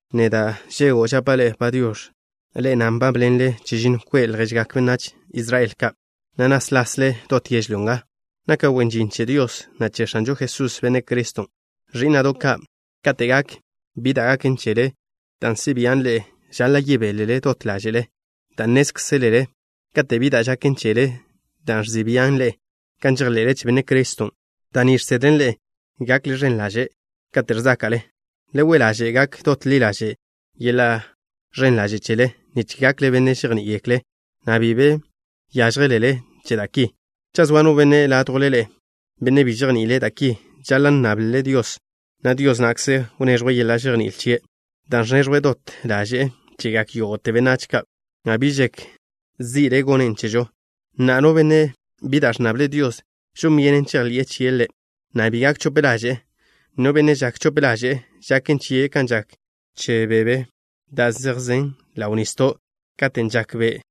Neda', Žedw, žapa' ḻe'e “Padiox̱.” Ḻe'e na' nbábḻenle chežinno kwe' lježgak benách Israel ka', na' náslasle dot yežlyó nga. Naka' wen žin che Dios, na' che X̱anžo Jesús, Benne' Criston'. Ẕí'na'do' ka', kate' gak bi da' gaken chele dan' si' bian' ḻe'e, žaḻa' yebélele dot ḻáže'le dan' nnézkzelele, kate' bi da' žaken chele da' ẕzi' bian' ḻe'e kan žejḻe'le che Benne' Criston', da' ni žsedlen ḻe'e gakle ẕen ḻaže' kate' ẕzáka'le. Le we' ḻaže' gak dot ḻi ḻaže' yeḻa' ẕen ḻaže' chele, nich gakle benne' žejní'igekle', na' bi be yážjelele che da' ki. Cha' zoa no benne' ládjwle ḻe'e, benne' bi žejni'ile' da' ki, žaḻa' nnable' Dios, na' Dios na'kze wneẕjwe' yeḻa' žejní'il chie', dan' ẕneẕjwe' dot ḻaže'e chegak yógo'te benách ka', na' bi žek zi'le' gonnen' chežo. Na'a, no benne' bi da' ẕnnable' Dios, žon byenen chejḻi'e chie' Ḻe', na' bi gak chope ḻaže'e. No benne' žak chope ḻaže'e, žaken chie' kan žak che bebe da' zejzen ḻaw nisdo' katen' žak be'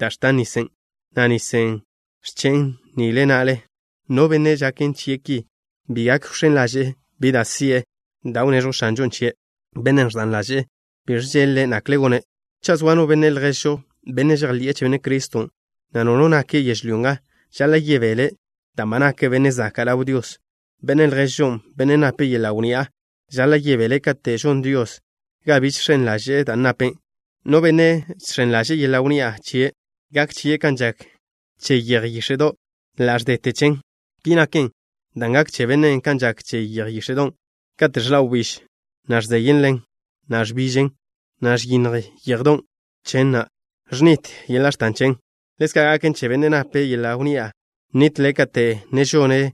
da' ẕtan nisen', na' nisen' ẕchen' nile na'le. No benne' žaken chie' ki bi gak wx̱én ḻaže'e bi da' si'e da' wneẕjw X̱anžon' chie'. Bennen' ẕda ḻaže'e bi ẕžeḻ-le' nakle gone'. Cha' zoa no benne' lježžo, benne' žejḻi'e che Benne' Criston', na' no no nake' yežlyó nga, žaḻa' yebele' dan' ba nake' benne' zaka' ḻaw Dios. Benne' lježžon', benne' nape' yeḻa' wnni'a, žaḻa' yebele' kate' žon Dios ga biž žx̱en ḻaže'e dan' nape'. No benne' žx̱en ḻaže'e yeḻa' wnni'a chie', gak chie' kan žak che yeje yíx̱e'do', ḻa' ẕdete chen. Ki naken, dan' gak che bennen' kan žak che yeje yíx̱e'don', katen' ẕḻa' wbíž, na' ẕzeyḻe'en, na' ḻa' ẕbižte yix̱en', na' ẕyinnj yéjedo' chen, na' ẕnitle yeḻa' x̱tan chen. Ḻezka' gaken che bennen' nape' yeḻa' wnni'a, nitle' kate' ne žone'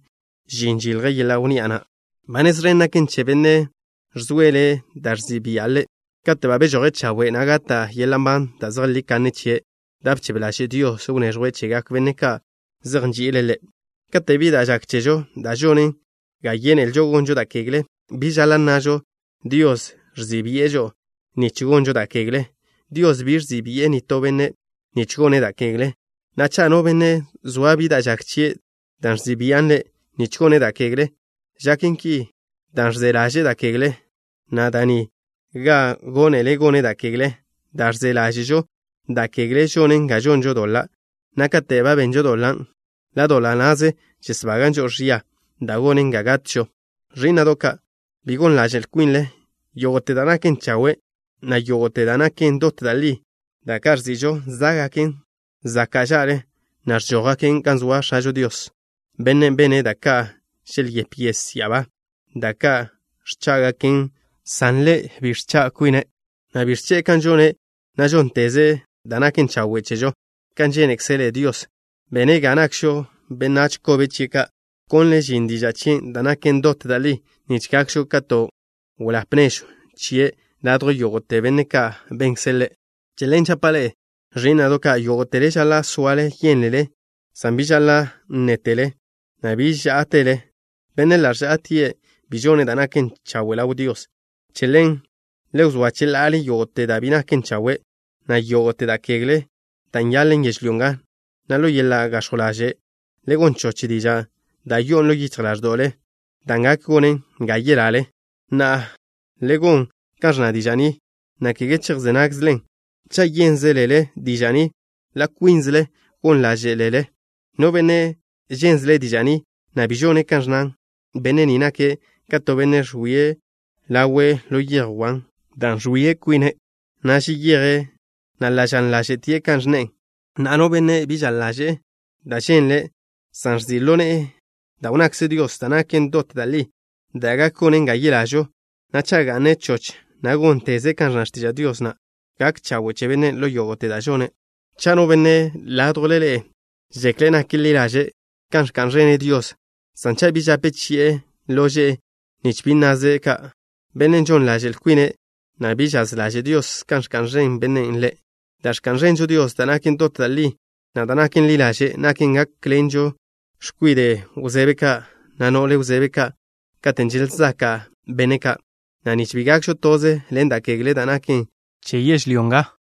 žin žilje' yeḻa' wnni'a na'. Ba nez ẕen gaken che bennen' ẕzoele' da' ẕzi' bia' ḻe'. Kate' ba bežoje' chawe', na' gata' yeḻa' nban da' zejlí kanne chie', da' bchebe ḻaže' Dios wneẕjwe' chegak benne' ka' zej nži'ile' Ḻe'. Kate' bi da' žak chežo da' žonen ga yénelžo gonžo da' kegle, bi žaḻa' nnažo: “Dios ẕzi' bi'e žo'o nich gonžo da' kegle.” Dios bi ẕzi' bi'e nitó benne' nich gone' da' kegle. Na'a, cha' no benne' zoa bi da' žak chie' da' ẕzi' bian' ḻe' nich gone' da' kegle, žaken ki dan' ẕze ḻaže'e da' kegle, na' da' ni benen ga gónele' gone' da' kegle. Da' ẕze ḻáže'žo da' kegle žonen ga žonžo doḻa', na' kate' ba benžo doḻan', ḻa' doḻa' na'ze žesbagan' žo'o ẕia, da' gonen ga gatžo. Ẕí'na'do' ka', bi gon ḻaže'l kwinle. Yógo'te da' naken chawe', na' yógo'te da' naken dot da' li, da' ka' ẕzi'žo, zá'gaken zaka' ža'le, na' ẕžójgaken gan zoa X̱ažo Dios, Bennen' bene' da' ka' želyép yes ya'abá, da' ka' ẕchá'gaken, san Ḻe' bi ẕcha' kwine', na' bi ẕche'e kan žone', na' žónnteze' da' naken chawe' chežo. Kan žénekzele Dios, bene' ga nakžo benách kobe chie' ka'. Bkonle' žin diža' chien' da' naken dot da' li, nich gakžo ka to weḻáp nežw chie' ladjw yógo'te benne' ka' benkze' Ḻe'. Che ḻen žapa' ḻe'e, ẕí'na'do' ka', yógo'tele žaḻa' soale yénlele, san bi žaḻa' nnétele, na' bi žá'atele. Bennen' ḻa' ẕžá'atie' bi žone' da' naken chawe' ḻaw Dios. Che ḻen, le wzóa cheḻa'ale yógo'te da' bi naken chawe', na' yógo'te da' kegle da' nyanḻe'en yežlyó nga, na' ḻo yeḻa' gax̱jw ḻaže' le gon choch dižan' da' yo'on ḻo yichj ḻáẕdo'le, dan' gak gonen ga yelale. Na'a, le gon kan ẕnna diža' ni, na' kege chejzé nágzelen. Cha' yénzelele diža' ni, ḻa' kwínzele gon ḻáže'lele. No benne' žénzele' diža' ni, na' bi žone' kan ẕnnan, benne' ni nake' ka to benne' ẕwie' ḻawe' ḻo yej wan, dan' ẕwia kwine', na' zeyeje', na' ḻa' žaḻ ḻáže'tie' kan ẕnne'e. Na'a, no benne' bi žaḻ ḻaže'e da' ženle', san ẕzi' ḻo ne'e da' wnnakze Dios da' naken dot da' li, da' gak gonen ga yelažo, na' cha' ga'ne' choch, na' gónteze' kan ẕnna x̱tiža' Dios na', gak chawe' che bennen' ḻo yógo'te da' žone'. Cha' no benne' ládjwle ḻe'e žekle' nak ḻi ḻaže' kan ẕka'n ẕene' Dios, san cha' bi žape chi'e lože'e nich bi nnaze' ka', bennen' žon ḻaže'l kwine', na' bi žaz ḻaže' Dios kan ẕka'n ẕen bennen' Ḻe'. Da' ẕka'n ẕenžo Dios, da' naken dot da' li, na' da' naken ḻi ḻaže', naken gákḻenžo x̱kwide' wzebe ka', na' no'le wzebe ka', katen' želzaka' benne' ka', na' nich bi gakžo toze ḻen da' kegle da' naken che yežlyó nga.